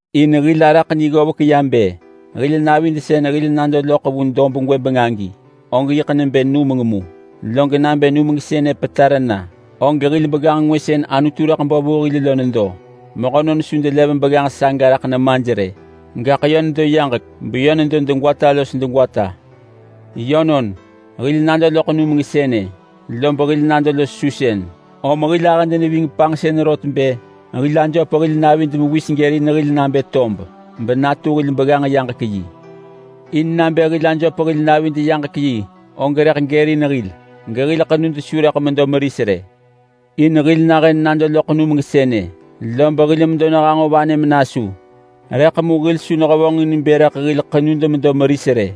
In hil araḳ ni ggovek bë hil navid sën hil nado loḳ vu dob gwëbeng agi og yiḳ nebë numeng mu. Log nabë numeng sënë petar na, og hil begganġ ngwë sën Anutu rëḳ bo vu hil lo nedo. Mehönon su delev begganġ saga raḳ nemaj rë, gaḳ yö nedo yaġek beyö nedo degwata los degwata. Yönon, hil nado loḳ numeng sënë lob hil nado los susën. Om hil ahëd neving panġsën rot bë hil ajöp hil navid mewis gërin hil nabë tob benatu hil begganġ yaġek-yi. In nabë hil ajöp hil navid yaġek-yi, og rëḳ gërin hil gehil ḳenud su rëḳ medo meris rë. In hil nahën nado loḳ numeng sënë, lob hil medo nehanġo vanë menasu. Rëḳ mu hil su nehevonġin bë rëḳ hil ḳenud medo meris rë,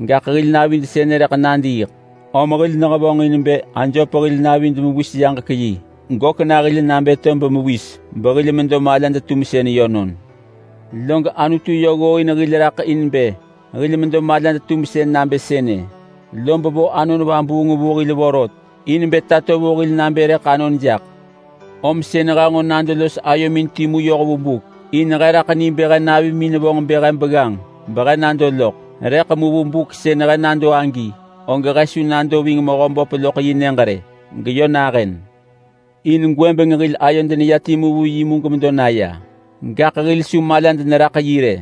gaḳ hil navid sënë rëḳ nadiiḳ, om hil nehevonġin bë ajöp hil navid mewis yaġek-yi gök na hil nabë tob mewis, behil medo malad-tumsën yönon. Log Anutu yö ggooin hil raḳ in bë hil medo malad-tumsën nabë sënë, lob vo Anon Vabuung vu hil vorot in bë tato vu hil nabë rëḳ anon jaḳ. Om sën he nġo nado los ayomin timu yoh vu buk, in he raḳ ni bë he navimin vonġ bë he begganġ behe nado loḳ, rëḳ mu vu buk sën he nado agi, og he su nado ving Mehöböp loḳ yi nyëġ rë geyö nahën. In gwëbeng hil ayod neya timu vu yi mu gemedo naya, gaḳ hil su malad neraḳ yi rë.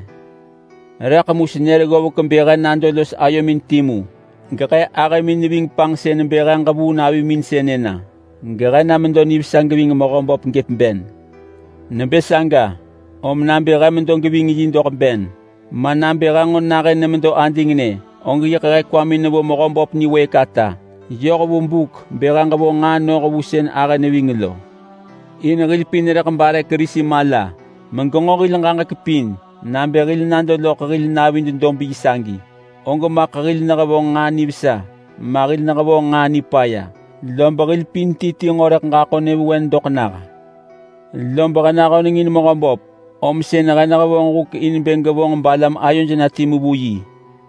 Rëḳ mu senër ggovek bë he nado los ayomin timu gehe ahëmin neving panġsën bë he ġevuu navimin sënë na gehe na medo nivesa geving Mehöböp gëp ben. Nebë saga, om nabë he medo geving yi doḳ ben, ma nabë he nġo nahën nemedo adingnë, og yiḳ he kwamin nevo Mehöböp niwëëk ata yoh vu buk bë he ġevonġ nġaa noh vu sën ahë neving lo. In hil pin rëḳ bare Kerisi mala megenġo hil ġaġek pin nabë hil nado loḳ hil navid dob yi sagi, og maḳ hil nehevonġ nġaa nivesa ma hil nehevonġ nġaa nipaya. Lob hil pin ti ti nġo rëḳ ġaḳo nyëvewen doḳ nah. Lob he nahöneng in Mehöböp, om sën he nehevonġ huk in bë ġevonġ balam ayoj na timu vu yi.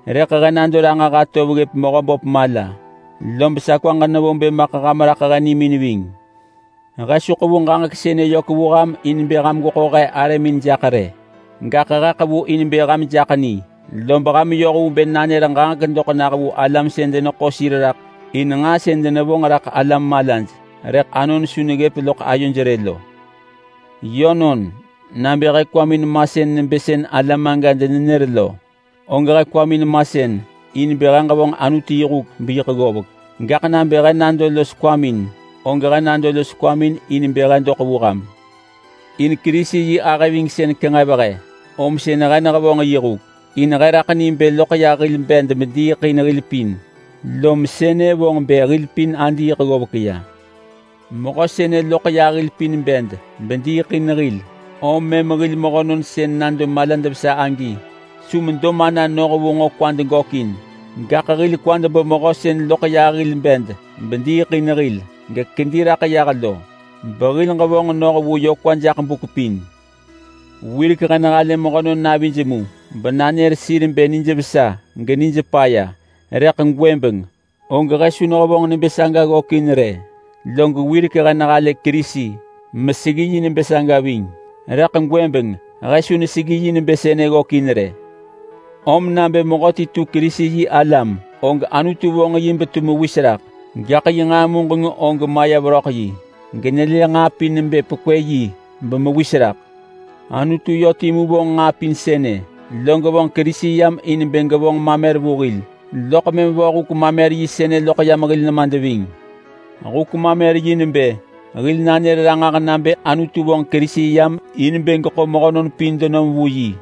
Rëḳ he nado ranġah atov ggëp Mehöböp mala, lob sa kwaġ nevo bë maḳ ham raḳ he nimin ving. He su ḳevu ġaġek sënë yök vu ham in bë ham gweḳo he arëmin jaḳ rë, gaḳ he ḳevu in bë ham jaḳ ni. Lob ham yoh vu bë nanër ġaġek doḳ nah vu alam sën deneḳo sir raḳ in nġaa sën denevonġ raḳ alam malaj rëḳ anon su neggëp loḳ ayoj rë lo. Yönon, nabë he kwamin masën nebë sën alam aga denenër lo, og he kwamin masën in bë he ġevonġ Anutu yi huk beyiḳ ggovek. Gaḳ nabë he nado los kwamin, og he nado los kwamin in bë he doḳ vu ham. In Kerisi yi ahëvingsën kenġev he, om sën he nehevonġ yi huk. In he raḳ ni bë loḳ yah hil bed mediiḳ in hil pin, lom sënë vonġ bë hil pin adiiḳ ggovek ya. Mehö sënë loḳ yah hil pin bed bediiḳ in hil, om mëm hil mehönon sën nado malad vesa agi su medo mana noh vu nġo kwad gökin. Gaḳ hil kwad bo Mehö sën loḳ yah hil bed bediiḳ in hil gekedi raḳ yah lo, behil ġevonġ noh vu yö kwa jaḳ buk pin. Wirek he nehalë mehönon navij mu benanër sir bë nijvesa genij paya, rëḳ gwëbeng he su nehevonġ nebë saga ggökin rë. Log wirek he nehalë Kerisi meseggi yi nebë saga ving, rëḳ gwëbeng he su neseggi yi nebë sënë ggökin rë. Om nabë mehöti tu Kerisi-yi-alam, og Anutu vonġ yi betu mewis raḳ, gaḳ yi nġaa muġeng og maya veröḳ yi genelë nġaa pin nebë pekwë yi bemewis raḳ. Anutu yö timu vonġ nġaa pin sënë, log vonġ Kerisi yam in bë gevonġ mamer vu hil, loḳ mëm vo huk-mamer-yi sënë loḳ yam hil nemad ving. Huk-mamer-yi nebë hil nanër ranġah nabë Anutu vonġ Kerisi yam in bë geḳo mehönon pin denom vu yi,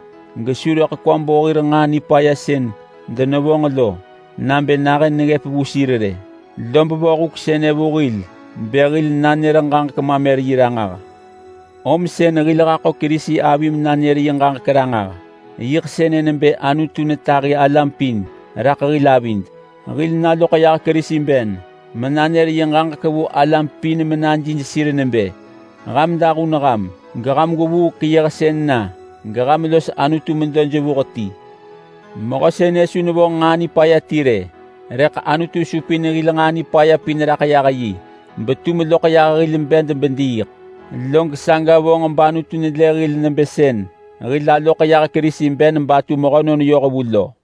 gesu rëḳ kwa bo hir nġaa nipaya sën denevonġ lo nabë nahën neggëp vu sir rë. Lob vo huk sënë vu hil bë hil nanër ġaġek-mamer-yi ranġah. Om sën hil haḳo Kerisi avi menanër yi ġaġek ranġah. Yiḳ sënë nebë Anutu netahi alam pin raḳ hil avid. Hil naloḳ yah Kerisi ben menanër yi ġaġek vu alam pin menajij sir nebë, “Ham dahun ham, geham gwevuu keyëhsën na geham los Anutu medo jevuh ti.” Mehö sënë su nevonġ nġaa nipaya ti rë, rëḳ Anutu supin hil nġaa nipaya pin yah raḳ yi betum loḳ yah hil bed bediiḳ. Log saga vonġ bAnutu nelë hil nebë sën hil aloḳ yah Kerisi ben batu mehönon yohvu lo.